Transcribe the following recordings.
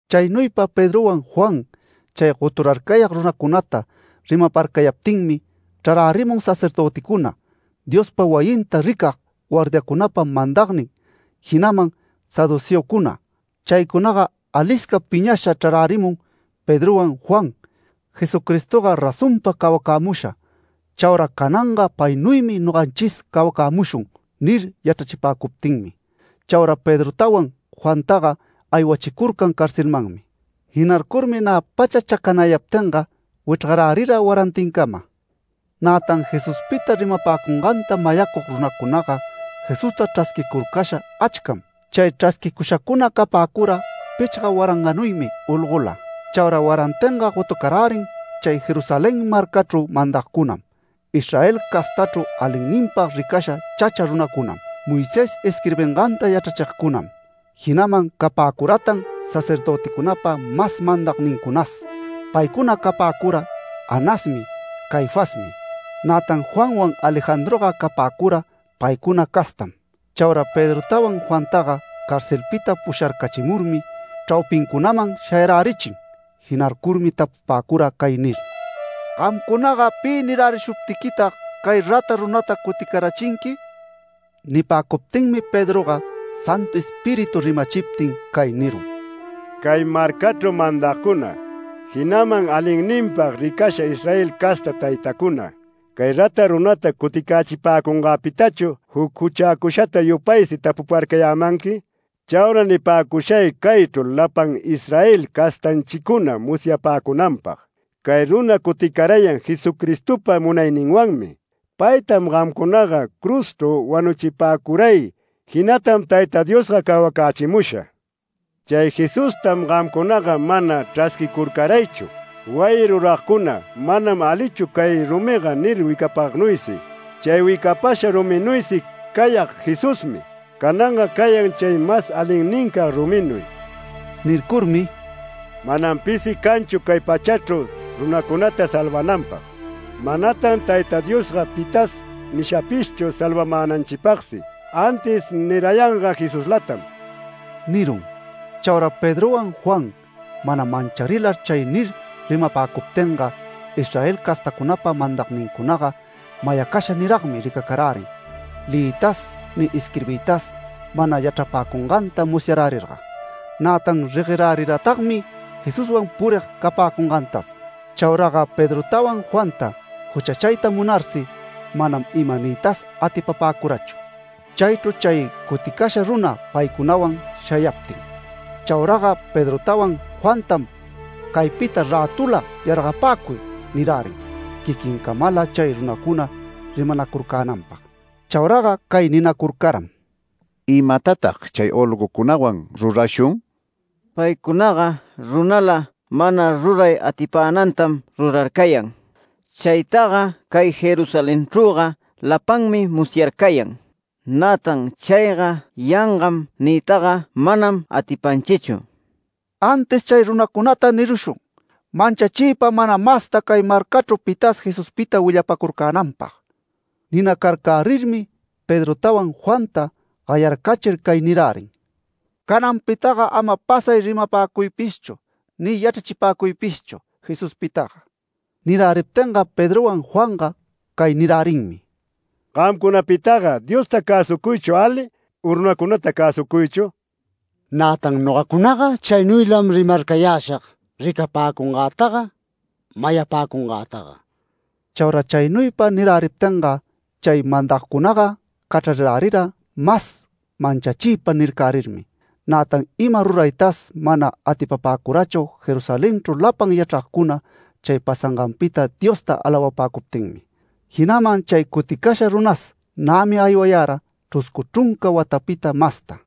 Chaynuypa Pedrowan Juan chay goturarcayag runacunata rimaparcayaptinmi chrarärimun sacerdöticuna, Diospa wayinta ricag guardiacunapa mandagnin, jinaman saduceocuna. Chaycunaga alisca piñasha chrarärimun Pedrowan Juan “Jesucristoga razonpam cawacämusha, chaura cananga paynuymi noganchis cawacämushun” nir yachrachipäcuptinmi. Chaura Pedrotawan Juantaga aywachicurcan carcelmanmi. Jinarcurmi nä pacha chacanaptinga wichrgarärira warantincama. Nätan Jesuspita rimapäcunganta mayacug runacunaga Jesusta chrasquicurcasha achcam. Chay chrasquicushacuna capäcura pichga waranganuymi olgola. Chaura warantinga, gotucarärin chay Jerusalén marcachru mandagcunam, Israel castachru alinninpag ricasha chacha runacunam, Moisés isquirbinganta yachrachigcunam. Jinaman capäcuratan sacerdöticunapa mas mandagnincunas. Paycuna capäcura Anasmi, Caifasmi. Nätan Juanwan Alejandroga capäcura paycuna castam. Chaura Pedrotawan Juantaga carcelpita pusharcachimurmi chraupincunaman shayarärichin. Jinarcurmi tapupäcura cay nir: “Gamcunaga, ¿pi nirärishuptiquitag cay rata runata cutirärichinqui?” Nipäcuptinmi Pedroga Santu Espíritu rimachiptin cay nirun: “Cay marcachru mandagcuna, jinaman alinninpag ricasha Israel casta taytacuna, ¿cay rata runata cuticächipäcungäpitachu juc juchäcushata yupaysi tapuparcayämanqui? Chaura nipäcushay caychru lapan Israel castanchicuna musyapäcunanpag: Cay runa cuticarayan Jesucristopa munayninwanmi. Paytam gamcunaga cruzchru wanuchipäcuray, jinatam Tayta Diosga cawacächimusha. Chay Jesustam gamcunaga mana chrasquicurcaraychu, wayi ruragcuna ‘Manam alichu cay rumiga’ nir wicapagnuysi. Chay wicapasha ruminuysi cayag Jesusmi, cananga cayan chay mas alinnincag ruminuy”. Nircurmi “Manam pisi canchu cay pachachru runacunata salvananpag. Manatan Tayta Diosga pitas nishapishchu salvamänanchipagsi, antis nirayanga Jesuslatam” nirun. Chaura Pedrowan Juan mana mancharilar chay nir rimapäcuptinga, Israel castacunapa mandagnincunaga mayacasha niragmi ricacarärin leyiytas ni isquirbiytas mana yachrapäcunganta musyarärirga. Nätan regueräriratagmi Jesuswan purig capäcungantas. Chauraga Pedrotawan Juanta juchachayta munarsi manam ima niytas atipapäcurachu, chaychru chay cuticasha runa paycunawan shayaptin. Chauraga Pedrotawan Juantam “Caypita rätula yargapäcuy” nirärin quiquincamala chay runacuna rimanacurcänanpag. Chauraga cay ninacurcaram: “¿Imatatag chay olgocunawan rurashun? Paycunaga runala mana ruray atipänantam rurararcayan. Chaytaga cay Jerusalenchrüga lapanmi musyarcayan. Nätan ‘Chayga yangam’ niytaga manam atipanchichu. Antis chay runacunata nirushun manchachiypa mana masta cay marcachru pitas Jesuspita willapacurcänanpag”. Ninacarcärirmi Pedrotawan Juanta gayarcachir cay nirärin: “Cananpitaga ama pasay rimapäcuypishchu ni yachrachipäcuypishchu Jesuspitaga”. Niräriptinga Pedrowan Juanga cay nirärinmi: “¿Gamcunapitaga Diosta cäsucuychu ali u runacunata cäsucuychu? Nätan nogacunaga chaynuylam rimarcayäshag ricapapäcungätaga mayapäcungätaga”. Chaura chaynuypa niräriptinga chay mandagcunaga cachrarirärira mas manchachiypa nircärirmi. Nätan ima ruraytas mana atipapäcurachu Jerusalenchru lapan yachragcuna chay pasanganpita Diosta alawapäcuptinmi. Jinaman chay cuticasha runas nämi aywayara chruscu chrunca watapita masta.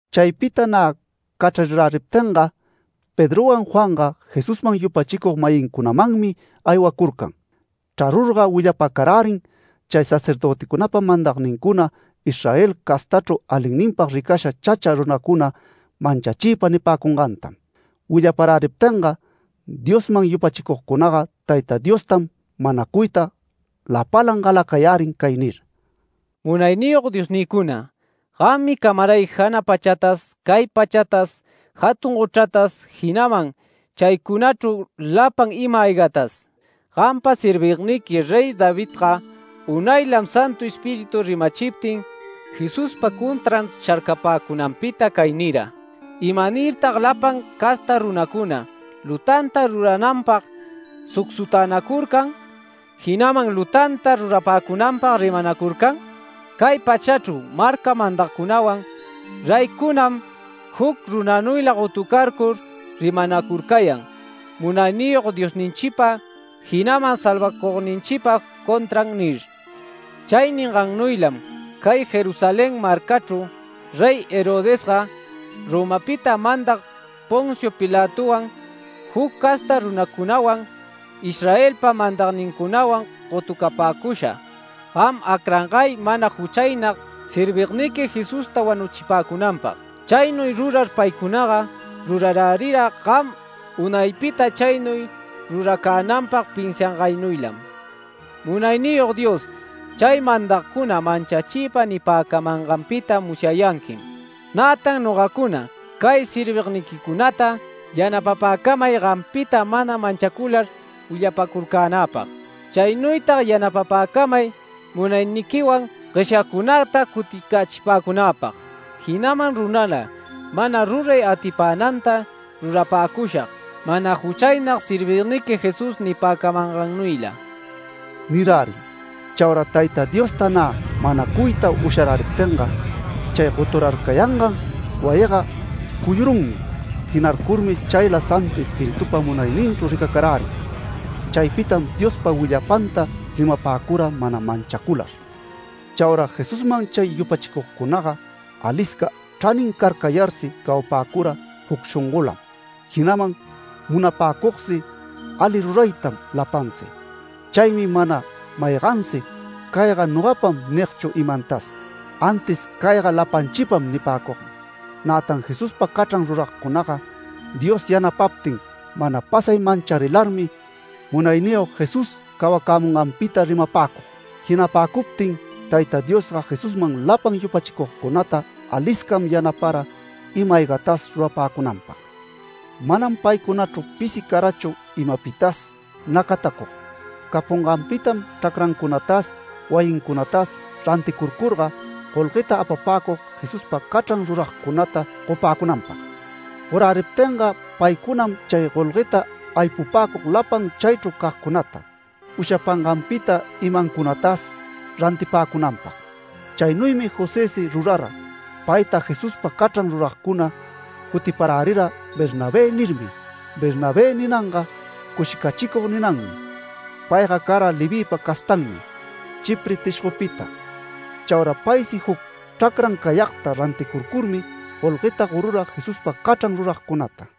Chaypita nä cachrariräriptinga, Pedrowan Juanga Jesusman yupachicug-mayincunamanmi aywacurcan. Chrarurga willapacarärin chay sacerdöticunapa mandagnincuna, Israel castachru alinninpag ricasha chacha runacuna manchachiypa nipäcungantam. Willaparäriptinga Diosman yupachicugcunaga Tayta Diostam manacuyta lapalan galacayärin cay nir: “Munayniyog Diosnïcuna, gammi camaray jana pachatas cay pachatas jatun gochratas, jinaman chaycunachru lapan ima-aygatas. Gampa servigniqui Rey Davidga unaylam Santu Espíritu rimachiptin Jesuspa contran sharcapäcunanpita cay nira: ‘¿Imanirtag lapan casta runacuna lutanta rurananpag sucsutänacurcan, jinaman lutanta rurapäcunanpag rimanacurcan? Cay pachachru marca mandagcunawan reycunam juc runanuyla gotucarcur rimanacurcayan Munayniyog Diosninchipa, jinaman salvacugninchipa contran’ nir. Chay ningaynuylam cay Jerusalén marcachru Rey Herodesga, Romapita mandag Poncio Pilatowan, juc casta runacunawan Israelpa mandagnincunawan gotucapäcusha, gam acrangay mana juchaynag servigniqui Jesusta wanuchipäcunanpag. Chaynuy rurar paycunaga rurarärira gam unaypita chaynuy ruracänanpag pinsiangaynuylam. Munayniyog Dios chay mandagcuna manchachiypa nipäcamanganpita musyayanquim. Nätan nogacuna cay servigniquicunata yanapapäcamay gampita mana manchacular willapacurcänäpag. Chaynuytag yanapapäcamay munayniquiwan gueshyagcunata cuticächipäcunäpag, jinaman runala mana ruray atipänanta rurapäcushag mana juchaynag servigniqui Jesús nipäcamangannuyla” nirärin. Chaura Tayta Diosta nä manacuyta usharäriptinga, chay goturarcayangan wayiga cuyurunmi. Jinarcurmi chayla Santu Espiritupa munayninchru ricacarärin. Chaypitam Diospa willapanta rimapäcura mana manchacular. Chaura Jesusman chay yupachicugcunaga alisca chranin carcayarsi, cawapäcura juc shongolam, jinaman munapäcugsi ali ruraytam lapansi. Chaymi mana maygansi “Cayga nogapam” nigchu imantas, antis “Cayga lapanchipam” nipäcug. Nätan Jesuspa cachran ruragcunaga Dios yanapaptin mana pasay mancharilarmi Munayniyog Jesús cawacämunganpita rimapäcug. Jinapäcuptin Tayta Diosga Jesusman lapan yupachicugcunata aliscam yanapara ima-aygatas rurapäcunanpag. Manam paycunachru pisi carachu imapitas nacatacug. Capunganpitam chracrancunatas, wayincunatas ranticurcurga, golgueta apapäcug Jesuspa cachran ruragcunata gopäcunanpag. Goräriptinga paycunam chay golgueta aypupäcug lapan chaychru cagcunata ushapanganpita imancunatas rantipäcunanpag. Chaynuymi Josësi rurara. Payta Jesuspa cachran ruragcuna jutiparärira “Bernabé” nirmi. ‘Bernabé’ ninanga ‘Cushicachicug’ ninanmi. Payga cara Levïpa castanmi, Chipre tishgopita. Chaura paysi juc chracran cayagta ranticurcurmi golgueta gorura Jesuspa cachran ruragcunata.